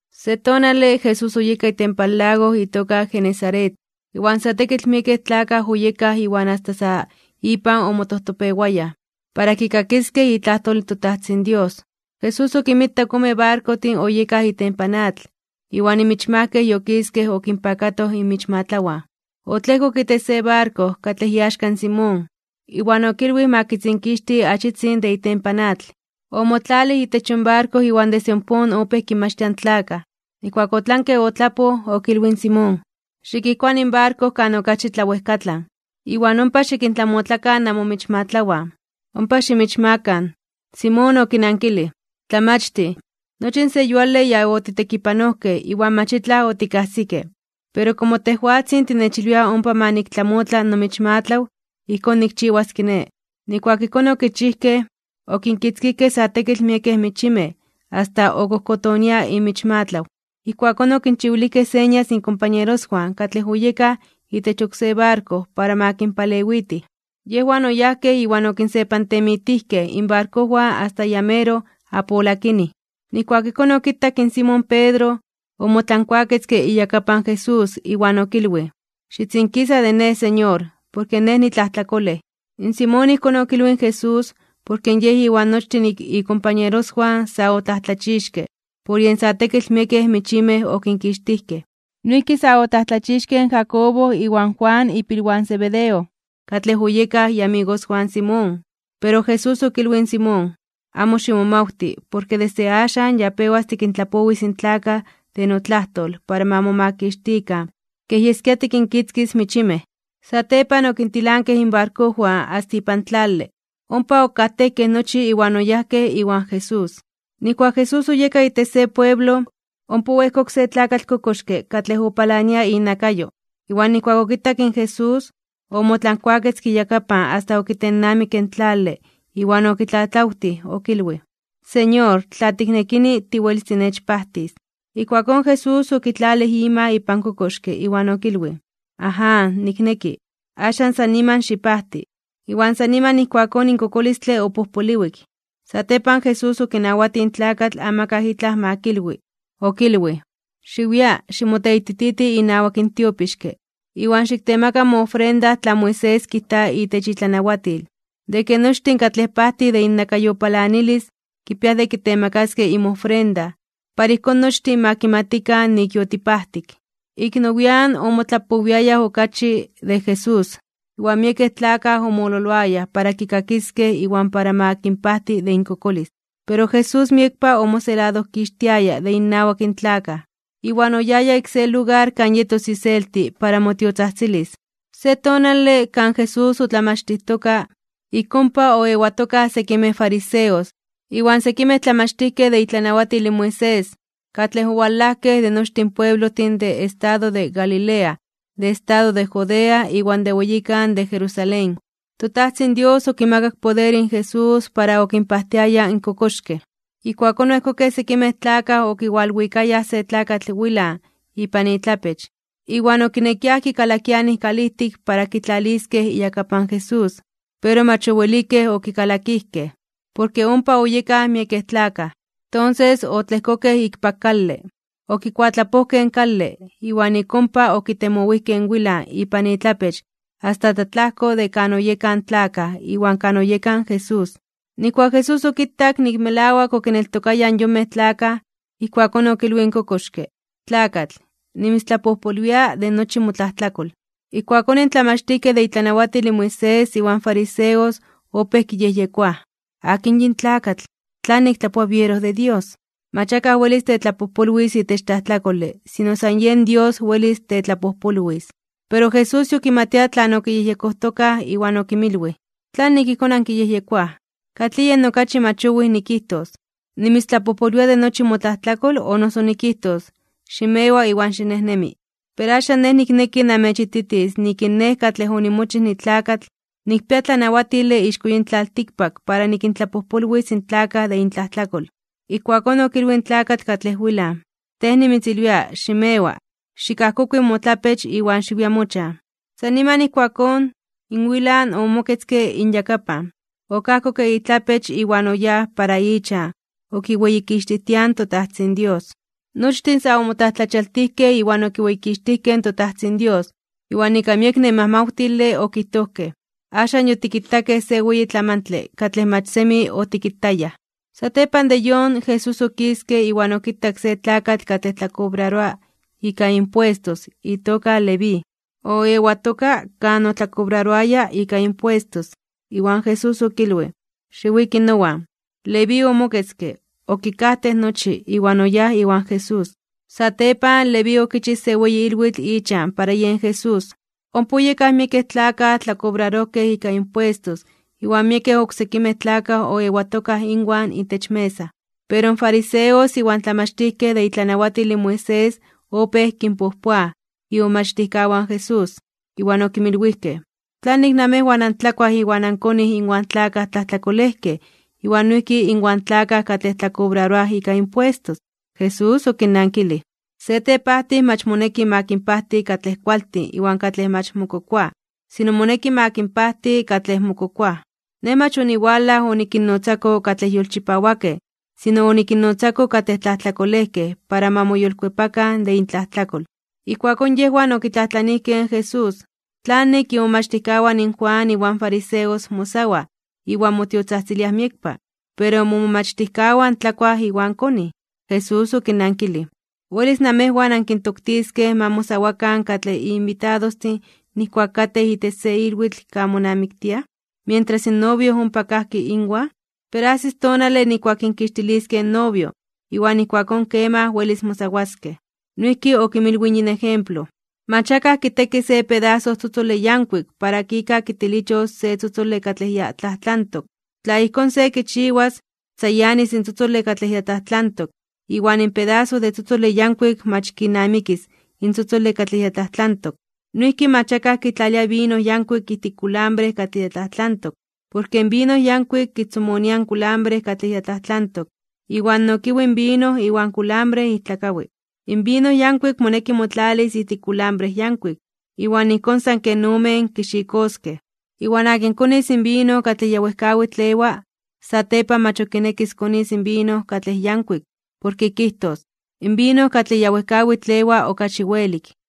Se tonale, Jesús oyeka itempan lago itoka Genesaret, iwan sa tekitl miekej tlakaj oyekaj iwan asta sa ipan omotojtopewayaj, para kikakiskej itlajtol in toTajtzin Dios. Jesús okinmitak ome barkojtin oyekaj itempan atl, iwan michmajkej yokiskej okinpakatoj inmichmatlawan. Otlejkok itech se barko, katlej iaxka in Simón, iwan okilwij ma kitzinkixti achitzin de itempan atl. Omotlalij itech yon barko iwan desde ompón opéj kinmachtia in tlakaj. Nijkuak otlanke otlapoj, okilwij in Simón: ―Xikijkuani in barko kan okachi tlawejkatlan, iwan ompa xikintlamotlakan namomichmatlawan. Ompa ximichmakan. In Simón okinankilij: ―Tlamachtij, nochi in se yuale ya otitekipanojkej iwan mach itlaj otikajsikej, pero komo tejwatzin tinechilwia ompa ma niktlamotla nomichmatlaw, ijkón nikchiwas kiné. Nijkuak ijkón okichijkej, okinkitzkijkej sa tekitl miekej michimej asta okojkotonia imichmatlaw. Ijkuakón okinchiwilijkej señas inkompañeroswan katlej oyekaj itech oksé barko para ma kinpalewitij. Yejwan oyajkej iwan okinsepantemitijkej inbarkojwan asta ya meroj apolakinij. Nijkuak ijkón okitak in Simón Pedro, omotlankuaketzke iyakapan Jesús, iwan okilwij: ―Xitzinkisa de nej, Señor, porke nej nitlajtlakolej. In Simón ijkón okilwij in Jesús, porke yej iwan nochtin ikompañeroswan sa otlajtlachixkej (omomajmawtijkej) por yen sa tekitl miekej michimej okinkixtijkej. Noijki sa otlajtlachixkej in Jacobo iwan Juan ipilwan in Zebedeo, katlej oyekaj iamigoswan in Simón. Pero Jesús okilwij in Simón: ―Amo ximomawti, porke desde axan ya pewas tikintlapowis in tlakaj de notlajtol para ma momakixtikan kej yeskia tikinkitzkis michimej. Satepan okintilankej inbarkojwan asta ipan tlale, ompa okajtejkej nochi iwan oyajkej iwan Jesús. Nijkuak Jesús oyeka itech se pueblo, ompa oejkok se tlakatl kokoxke katlej opalania inakayo, iwan nijkuak okitak in Jesús, omotlankuaketzke iyakapan asta okitennamikke in tlale iwan okitlatlawtij okilwij: ―Señor, tla tiknekini, tiwelis tinechpajtis. Ijkuakón Jesús okitlalij ima ipan kokoxke, iwan okilwij: ―Aján, nikneki. Axan san niman xipajti. Iwan san niman ijkuakón in kokolistle opojpoliwik. Satepan Jesús okinawatij in tlakatl amakaj itlaj ma kilwi. Okilwij: ―Xiwia, ximoteitititi inawak in tiopixke, iwan xiktemaka moofrenda tlan Moisés kijta itech itlanawatil, de ke nochtin katlej pajtij de innakayopalanalis, kipiaj de kitemakaskej inmofrenda, para ijkón nochtin ma kimatikan nik yotipajtik. Ik nowian (nian nepa) omotlapowiayaj okachi de Jesús, iwan miekej tlakaj omololoayaj para kikakiskej iwan para ma kinpajti de inkokolis. Pero Jesús miekpa omoseladojkixtiaya de innawak in tlakaj, iwan oyaya ik se lugar kan yetos iselti para motiotzajtzilis. Se tonale, kan Jesús otlamachtijtoka, ik ompa oewatokaj sekimej fariseos, iwan sekimej tlamachtijkej de itlanawatil in Moisés, katlej owalajkej de nochtin pueblojtin de estado de Galilea, de estado de Judea iwan de weyikan de Jerusalén. ToTajtzin Dios okimakak poder in Jesús para okinpajtiaya in kokoxkej. Ijkuakón oejkokej sekimej tlakaj okiwalwikayaj se tlakatl wilan (temetlatzin) ipan itlapech, iwan okinekiaj kikalakianij kalijtik para kitlaliskej iyakapan Jesús. Pero mach owelik okikalakijkej, porke ompa oyekaj miekej tlakaj. Tonses otlejkokej ikpak kale. Okikuatlapojkej in kale, iwan ik ompa okitemowijkej in wilan ipan itlapech asta tlatlajko de kan oyekaj in tlakaj iwan kan oyeka in Jesús. Nijkuak in Jesús okitak nik melawak okineltokayaj in yonmej tlakaj, ijkuakón okilwij in kokoxke: ―Tlakatl, nimitztlapojpolwia de nochi motlajtlakol. Ijkuakón in tlamachtijkej de itlanawatil in Moisés iwan fariseos opéj kiyejyekoaj: “¿Akin yin tlakatl? ¿Tlanik tlajtoa biero de Dios? Mach akaj welis tetlapojpolwis itech tlajtlakole, sino san yen Dios welis tetlapojpolwis.” Pero Jesús yokimatia tlan okiyejyekojtokaj, iwan okinmilwij: ―¿Tlanik ijkón ankiyejyekoaj? ¿Katlij yen okachi mach owij nikijtos: “Nimitztlapojpolwia de nochi motlajtlakol”, o noso nikijtos: “Ximewa iwan xinejnemi”? Pero axan Nej nikneki namechititis nik in Nej katlej onimochij nitlakatl, nikpia tlanawatile ixko yin tlaltikpak para nikintlapojpolwis in tlakaj de intlajtlakol. Ijkuakón okilwij in tlakatl katlej wilan: ―Tej nimitzilwia, ximewa, xikajkokui motlapech iwan xiwia mochan. San niman ijkuakón, in wilan (temetlatzin) omoketzke inyakapan, okajkokke itlapech iwan oyáj para ichan okiweyikixtijtiaj in toTajtzin Dios. Nochtin sa omotlajtlachialtijkej (omomajmawtijkej) iwan okiweyikixtijkej in toTajtzin Dios, iwan ika miek nemajmawtile okijtojkej: ―Axan yotikitakej se weyi tlamantle katlej mach semi otikitayaj. Satepan de yon, Jesús okiske iwan okitak se tlakatl katlej tlakobraroa ika impuestos itoka Leví. Oewatoka kan otlakobraroaya ika impuestos, iwan Jesús okilwij: ―Xiwiki nowan. Leví omoketzke, okikajtej nochi, iwan oyáj iwan Jesús. Satepan, Leví okichij se weyi ilwitl ichan para yen Jesús. Ompa oyekaj miekej tlakaj tlakobrarojkej ika impuestos iwan miekej oksekimej tlakaj oewatokaj inwan itech mesa. Pero in fariseos iwan in tlamachtijkej de itlanawatil in Moisés opéj kinpojpoaj imomachtijkawan in Jesús, iwan okinmilwijkej: ―¿Tlanik namejwan antlakuaj iwan ankonij inwan tlakaj tlajtlakolejkej iwan noijki inwan tlakaj katlej tlakobraroaj ika impuestos? Jesús okinnankilij: ―Se tepajtij mach moneki ma kinpajti katlej kualtin iwan katlej mach mokokoaj, sino moneki ma kinpajti katlej mokokoaj. Nej mach oniwalaj onikinnotzako katlej yolchipawakej, sino onikinnotzako katlej tlajtlakolejkej para ma moyolkuepakan de intlajtlakol. Ijkuakón yejwan okitlajtlanijkej in Jesús: ―¿Tlanik imomachtijkawan in Juan iwan fariseos mosawaj iwan motiotzajtziliaj miekpa, pero momomachtijkawan tlakuaj iwan konij? Jesús okinnankilij: ―¿Welis namejwan ankintoktiskej ma mosawakan katlej inbitadostin nijkuak katej itech se ilwitl kan monamiktiaj, mientras in novio ompa kajki inwan? Pero ajsis tonale nijkuak kinkixtiliskej in novio, iwan ijkuakón kemaj welis mosawaskej. Noijki okinmilwij yin ejemplo: ―Mach akaj kiteki se pedaso tzotzole yankuik para ika kitilichos se tzotzole katlej ya tlajtlantok. Tla ijkón se kichiwas, tzayanis in tzotzole katlej ya tlajtlantok, iwan in pedaso de tzotzole yankuik mach kinamikis in tzotzole katlej ya tlajtlantok. Noijki mach akaj kitlalia vino yankuik ijtik kulambre katlej ya tlajtlantok. Porke in vino yankuik kitzomonia in kulambre katlej ya tlajtlantok, iwan nokiwi in vino iwan kulambre ijtlakawi. In vino yankuik moneki motlalis ijtik kulambre yankuik, iwan ijkón san ken omen kixikoskej. Iwan akin konis in vino katlej ya wejkawitl ewa, satepan mach ok kinekis konis vino katlej yankuik, porke kijtos: “In vino katlej ya wejkawitl ewa, okachi welik.”